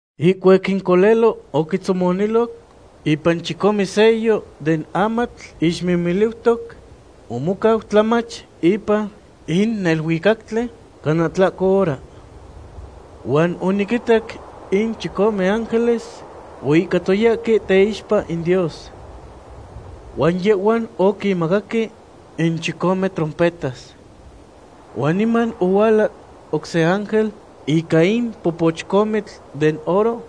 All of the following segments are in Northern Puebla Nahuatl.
Ihcuac in Colelo oquitzomoniloc ipan chicome sello den amatl ixmimiliutoc, omocau tlamach ipan in neluicactli cana tlahco hora. Huan oniquinitac in chicome ángeles oihcatoyahque teixpa in Dios. Huan yehhuan oquinmacaque in chicome trompetas. Huan niman ohuala oc se ángel ica in popochcomitl den oro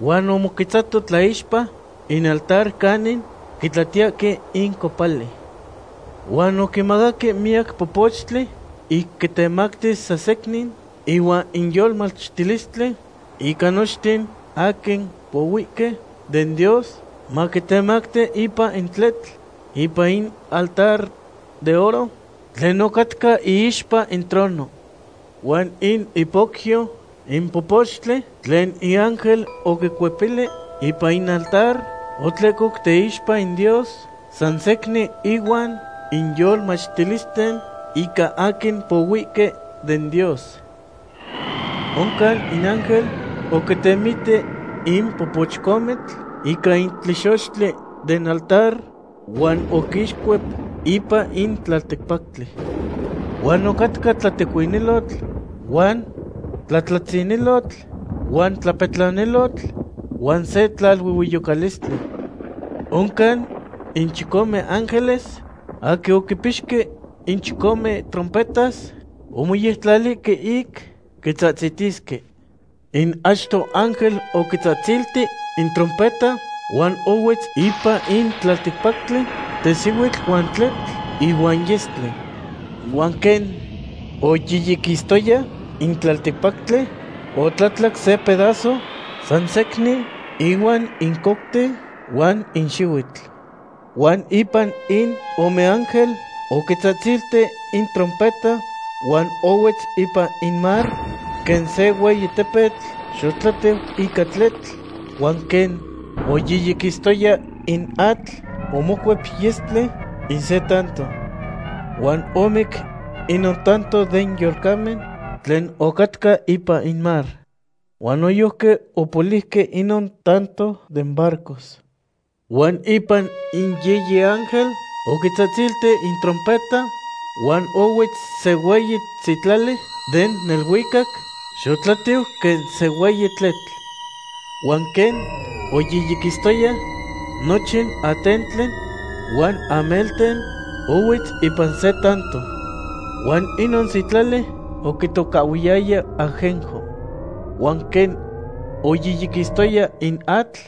huan omoquetzato tlaixpa in altar canin quitlatiyahque in copali. Huan oquimacaque miyac popochtli ic quitemactis san secnin ihuan in yolmachtilistli ica nochten aquin pohuihque den Dios, maquitemacti ipan in tletl ipan in altar de oro tlen ocatca iixpa in trono. Huan in ipocyo in popochtli tlen in ángel oquicuepili ipan in altar otlehcoc teixpa in Dios san secnin ihuan in yolmachtilisten ica aquin pohuihque den Dios. Oncan in ángel oquitemiti in popochcomitl ica in tlexochtli den altar huan oquixcuep ipan in tlalticpactli. Huan ocatca tlatecuinilotl huan tlatlatzinilotl, huan tlapetlanilotl huan se tlaluehueyocalistli. Oncan in chicome ángeles aquin oquipixque in chicome trompetas omoyectlalihque ic quitzahtzitisque. In achto ángel oquitzahtzilti in trompeta huan ohuetz ipan in in tlalticpactli tesihuitl huan tletl ihuan yestli. Huan quen oyiyiquistoya in tlalticpactli, otlatlac se pedazo san secnin ihuan in couten huan in xihuitl. Huan ipan in ome ángel oquitzahtzilti in trompeta huan ohuetz ipan in mar quen se hueyi tepetl xotlatiu ica tletl, huan quen oyiyiquistoya in atl, omocuep yestli in se tanto. Huan omic inon tanto den yolcamen tlen ocatca ipan in mar. Huan noyojqui opoliuque inon tanto den barcos. Huan ipan in yiyi ángel oquitzahtzilti in trompeta huan ohuetz se hueyi sitlali den neluicac, xotlatiu quen se hueyi tletl. Huan quen oyiyiquistoya nochin atentli huan amelten, ohuetz ipan se tanto. Huan inon sitlali oquitocahhuiyaya Ajenjo. Huan quen oyiyiquistoya in atl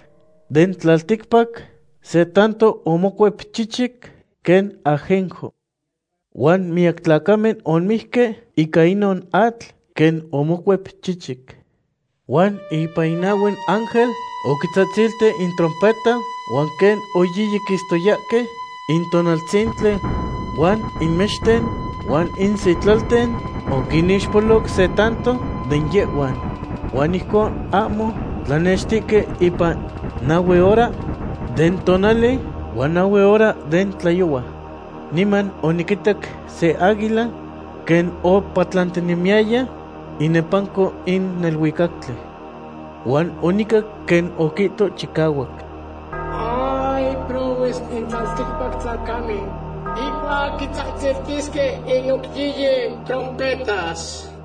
den tlalticpac se tanto omocuep chichic quen ajenjo. Huan miyac tlacamen omijque ica inon atl, quen omocuep chichic. Huan ipan in nahue ángel oquitzahtzilti in trompeta huan quen oyiyiquistoyahque in tonaltzintli huan in mexten huan in sitlalten, oquinixpolo se tanto den yehhuan. Huan ijconon ahmo tlanextihque ipan nahue hora den tonali huan nahue hora den tlayohua. Niman oniquitac se águila quen opatlantinemiyaya inepanco in neluicactli. Huan onicac quen oquihto chicahuac: ―¡Ay, prohues in tlalticpac tlacamen ihcuac quitzahtziltisque in oc yiyi trompetas!